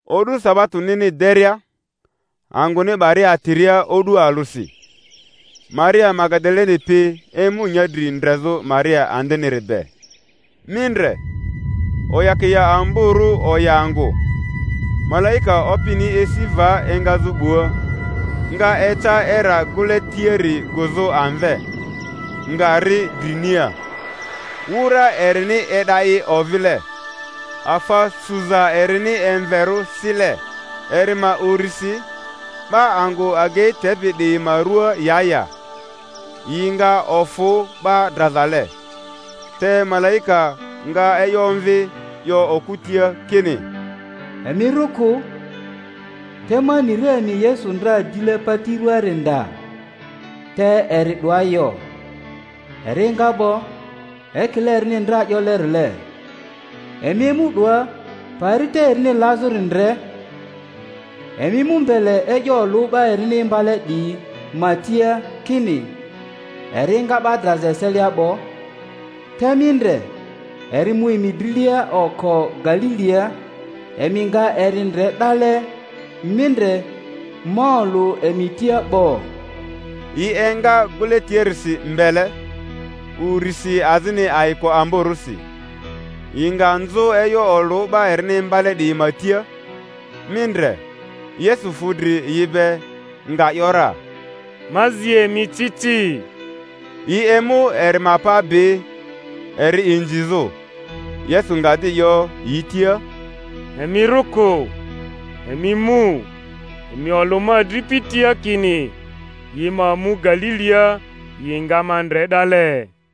O'du sabatonini deria, angᴜni 'baria atiria o'du alᴜsi, Maria Magadaleni pi emu nyadri ndrezᴜ Maria andiniri be. Mi ndre, oyakia amborᴜ oya angᴜ; malaika Opini esi va engazᴜ 'bua, nga eca era gᴜle tiari gᴜzᴜ amve, nga ri drinia. Wura erini e'da i ovile, afa suza erini emverᴜ sile. Eri ma urisi 'ba angᴜ agei tepi 'diyi ma rua ya ya, yi nga ofᴜ 'ba drazale. Te malaika nga e'yo omvi 'yo okᴜ tia kini, Emi rᴜ kᴜ; te ma ni ra emi Yesu ndra dile pati rᴜaari nda. Te eri 'doa yo; eri enga 'bo, ekile erini ndra 'yolerile. Emi emu 'doa, pari te erini lazᴜri ndre. Emi mu mbele e'yo olᴜ 'ba erini imbale 'diyi ma tia, kini, Eri enga 'ba draza eselia 'bo, te mi ndre, eri mu emi drilia oko Galilia; emi nga eri ndre 'dale. Mi ndre, ma olᴜ emi tia 'bo. Yi enga gᴜle tiarisi mbele, urisi azini ayiko amborᴜsi, yi nga nzᴜ e'yo olᴜ 'ba erini imbale 'diyi ma tia. Mi ndre, Yesu fu dri yi be, nga ‘yora, Ma zi emi ci ci! Yi emu eri ma pa bi, eri inzizᴜ. Yesu nga di 'yo yi tia, Emi rᴜ kᴜ; emi mu, emi olᴜ ma adripi tia kini yi ma mu Galilia, yi nga ma ndre 'dale.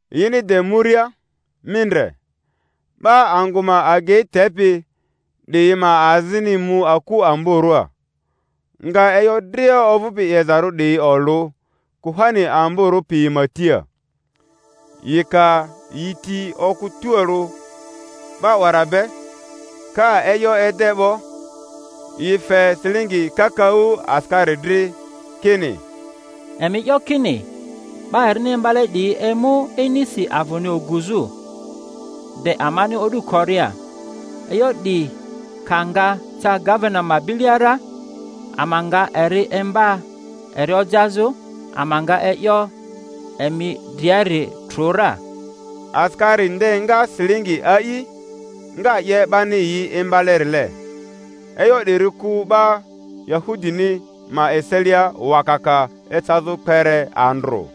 Yini de muria, mi ndre, 'ba angᴜ ma agei tepi 'diyi ma azini mu aku amborᴜa, nga e'yo dria ovᴜpi 'yezarᴜ 'diyi olᴜ kuhani amborᴜ piyi ma tia. Yi ka yi ti okᴜ tualᴜ 'ba 'wara be, ka e'yo ede 'bo, yi fe silingi kakaᴜ asikari dri, kini, Emi 'yo kini 'Ba erini imbale 'diyi emu inisi avᴜni oguzᴜ, de amani o'du koria. E'yo 'di ka nga ca gavena ma bilia ra, ama nga eri imba eri ojazᴜ, ama nga e'yo emi driari trᴜ ra. Asikari nde nga silingi a'i, nga 'ye 'bani yi imbalerile; e'yo 'diri ku 'ba Yahudini ma eselia wakaka ecazᴜ kpere andrᴜ.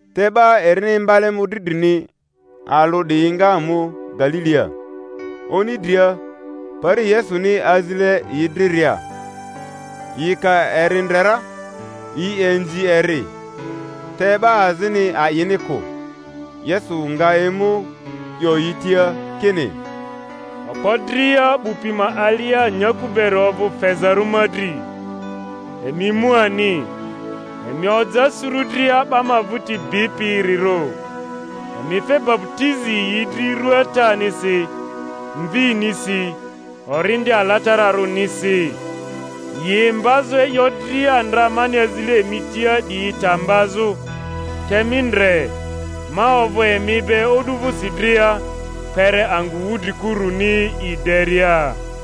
Te 'ba erini imbale mᴜdri drini alᴜ 'diyi nga mu Galilia, oni dria, pari Yesuni azile yi driria. Yi ka eri ndre ra, yi inzi eri; te 'ba azini a'ini kᴜ. Yesu nga emu 'yo yi tia kini, Okpo dria 'bu pi ma alia nyaku beri ovᴜ fezarᴜ ma dri. Emi mu ani, emi oja suru dria 'ba ma vᴜti bipirirᴜ, emi fe baputizi yi dri ru Atanisi, Mvinisi, Orindi Alatararᴜnisi, yi imbazᴜ e'yo dria ndra mani azile emi tia 'diyi ta mbazᴜ; te mi ndre, ma ovᴜ emi be o'du vᴜsi dria, kpere angᴜ wudrikuruni i deria.